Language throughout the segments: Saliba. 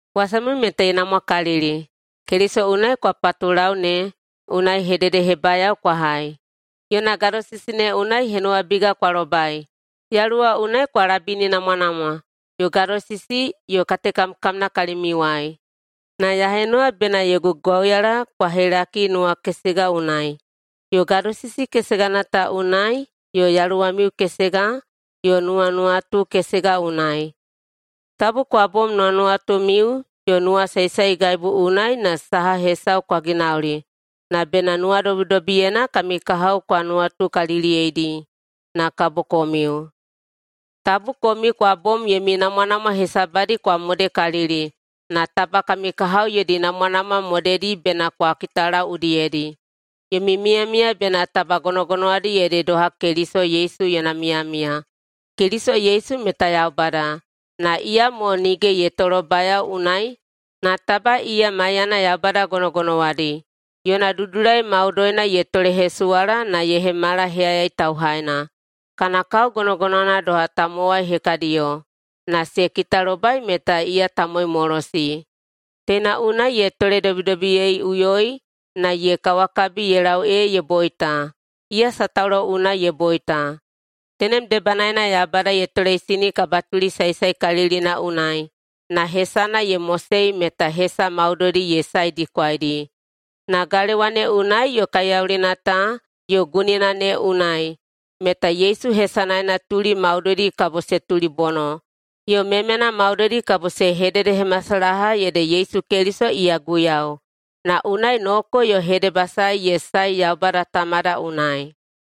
Wasamiu meta ye namwakalili: Keliso unai kwa patulau ne unai hededehebayao kwa hai, yona gadosisi ne unai henuwabiga kwa lobai, Yaluwa unai kwa labininamwanamwa, yo gadosisi yo katekamkamna kalimiuwai. Na ya henuwa bena yogu gwauyala kwa helaki nuwakesega unai, yo gadosisi kesegana ta unai yo yaluwamiu kesega yo nuwanuwatu kesega unai. Tabu kwa bom nuwanuwatumiu yo nuwasaesaegaibu unai na saha hesau kwa ginauli, na bena nuwadobidobiyena kami kahao kwa nuwatukaliliyeidi na kabo komiu. Tabu komiu kwa bom yomi namwanamwa hesabadi kwa modekalili, na taba kami kahao yodi namwanamwa modedi bena kwa kitalau udiyedi. Yomi miyamiya meta taba gonogonowadi ede doha Keliso Yesu yona miyamiya. Keliso Yesu meta Yaubada, na iyamo nige ye tolobayao unai na taba iya maiyana Yaubada gonogonowadi. Yona dudulai maudoina ye tolehesuwala na ye hemala heyayai tauhaina. Kana kao gonogonowana doha tamowai hekadiyo na se kitalobai meta iya tamowaimolosi. Teina unai ye toledobidobiyeiꞌuyoi na ye kawakabi ye lau ee ye boita, iya sataulo unai ye boita. Tenem debanaena Yaubada ye toleisini kabatuli saesaekalilina unai na hesana ye mosei meta hesa maudoidi ye saedikwaidi, na galewa ne unai yo kaiyaulina ta yo gunina ne unai meta Yesu hesanaena tuli maudoidi kabo se tulibono, yo memena maudoidi kabo se hededehemasalaha ede Yesu Keliso iya Guiyau, na unai noko yo hedebasae ye sae Yaubada Tamada unai.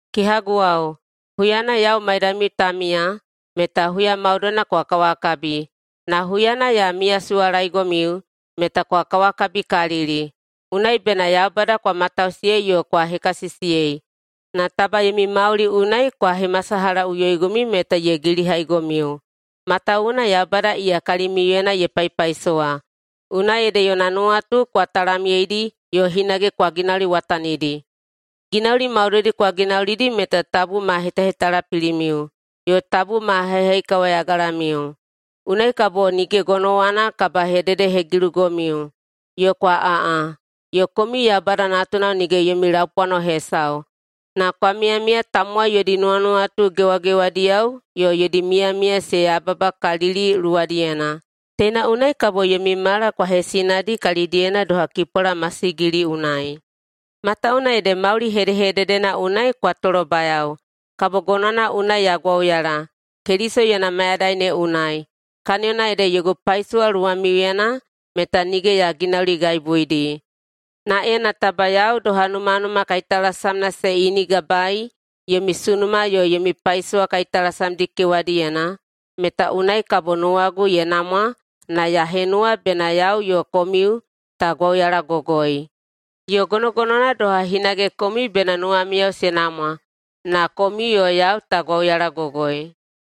Kehaguwao, huyana yau maidamiu ta miya meta huya maudoina kwa kawakabi, na huyana ya miyasuwalaegomiu meta kwa kawakabikalili. Unai bena Yaubada kwa matausiyei yo kwa hekasisiyei na taba yomi mauli unai kwa hemasalahaꞌuyoigomiu meta ye gilihaigomiu, matawuwuna Yaubada iya kalimiuyena ye paipaisowa, unai ede yona nuwatu kwa talamyeidi yo hinage kwa ginauliwatanidi. Ginauli maudoidi kwa ginaulidi meta tabu ma hetahetalapilimiu yo tabu ma haihaikawayagalamiu. Unai kabo nige gonowana kabahededehegilugomiu, yo kwa aꞌa, yo komiu Yaubada natunao nige yomi laupwano hesau, na kwa miyamiya tamowai yodi nuwanuwatu gewagewadiyao yo yodi miyamiya se yababakalili luwadiyena. Teina unai kabo yomi mala kwa hesinadi kalidiyena doha kipwala masigili unai, matawuwuna ede mauli hedehededena unai kwa tolobayao. Kabo gonowana unai ya gwauyala Keliso yona mayadai ne unai, kaniyona ede yogu paisowa luwamiuyena meta nige ya ginauligaibuidi. Na ena taba yau doha numanuma kaitalasamna se inigabaei yomi sunuma yo yomi paisowa kaitalasamdi kewadiyena, meta unai kabo nuwagu ye namwa na ya henuwa bena yau yo komiu ta gwauyalagogoi. Yo gonogonowana doha hinage komiu bena nuwamiyao se namwa na komiu yo yau ta gwauyalagogoi.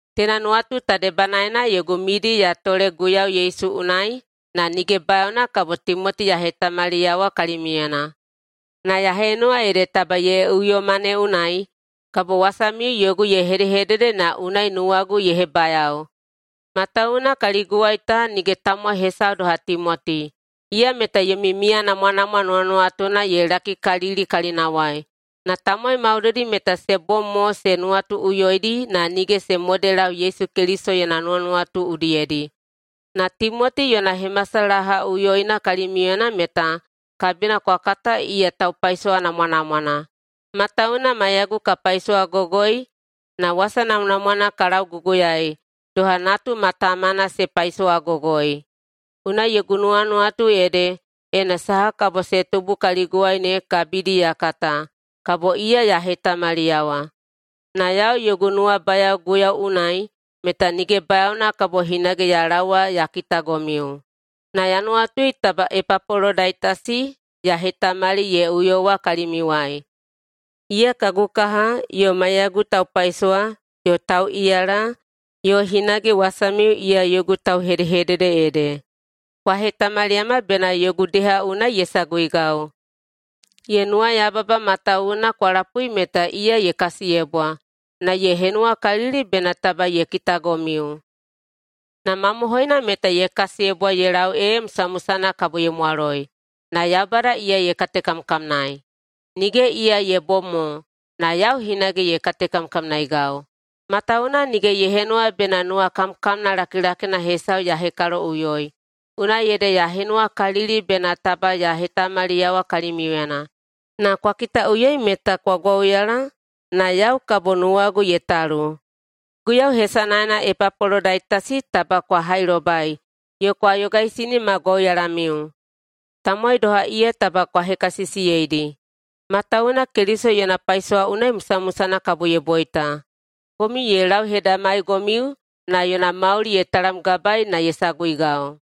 Teina nuwatu ta debanaena yogu midi ya tole Guiyau Yesu unai na nige bayaona kabo Timoti ya hetamaliyawa kalimiuyena. Na ya henuwa ede taba ye uyoma ne unai kabo wasamiu yogu ye hedehedede na unai nuwagu ye hebayao. Matawuwuna kaliguwai ta nige tamowai hesau doha Timoti. Iya meta yomi miyanamwanamwa nuwanuwatuna ye lakikalili kalinawai. Na tamowai maudoidi meta se bom mo se nuwatuꞌuyoidi na nige se modelau Yesu Keliso yona nuwanuwatu udiyedi. Na Timoti yona hemasalahaꞌuyoina kalimiuyena meta kabina kwa kata iya taupaisowa namwanamwana. Matawuwuna maiyagu ka paisowagogoi na wasa namwanamwana ka lauguguyaei doha natu ma tamana se paisowagogoi. Unai yogu nuwanuwatu ede, ena saha kabo se tubu kaliguwai ne kabidi ya kata, kabo iya ya hetamaliyawa. Na yau yogu nuwabayao Guiyau unai meta nige bayaona kabo hinage ya laowa ya kitagomiu. Na ya nuwatui taba Epapolodaitasi ya hetamali ye uyowa kalimiuwai. Iya kagu kaha yo maiyagu taupaisowa yo tauꞌiyala, yo hinage wasamiu iya yogu tauhedehedede ede, kwa hetamaliyama bena yogu deha unai ye saguigau. Ye nuwayababa matawuwuna kwa lapui meta iya ye kasiyebwa, na ye henuwakalili bena taba ye kitagomiu. Na mamohoina meta ye kasiyebwa ye lau ee musamusana kabo ye mwaloi, na Yaubada iya ye katekamkamnaei. Nige iya ye bom mo, na yau hinage ye katekamkamnaeigau, matawuwuna nige ye henuwa bena nuwakamkamna lakilakina hesau ya hekaloꞌuyoi. Unai ede ya henuwakalili bena taba ya hetamaliyawa kalimiuyena, na kwa kitaꞌuyoi meta kwa gwauyala na yau kabo nuwagu ye talu. Guiyau hesanaena Epapolodaitasi taba kwa hailobai yo kwa yogaisini ma gwauyalamiu. Tamowai doha iya taba kwa hekasisiyeidi, matawuwuna Keliso yona paisowa unai musamusana kabo ye boita. Komiu ye lauhedamaigomiu na yona mauli ye talamgabaei na ye saguigau.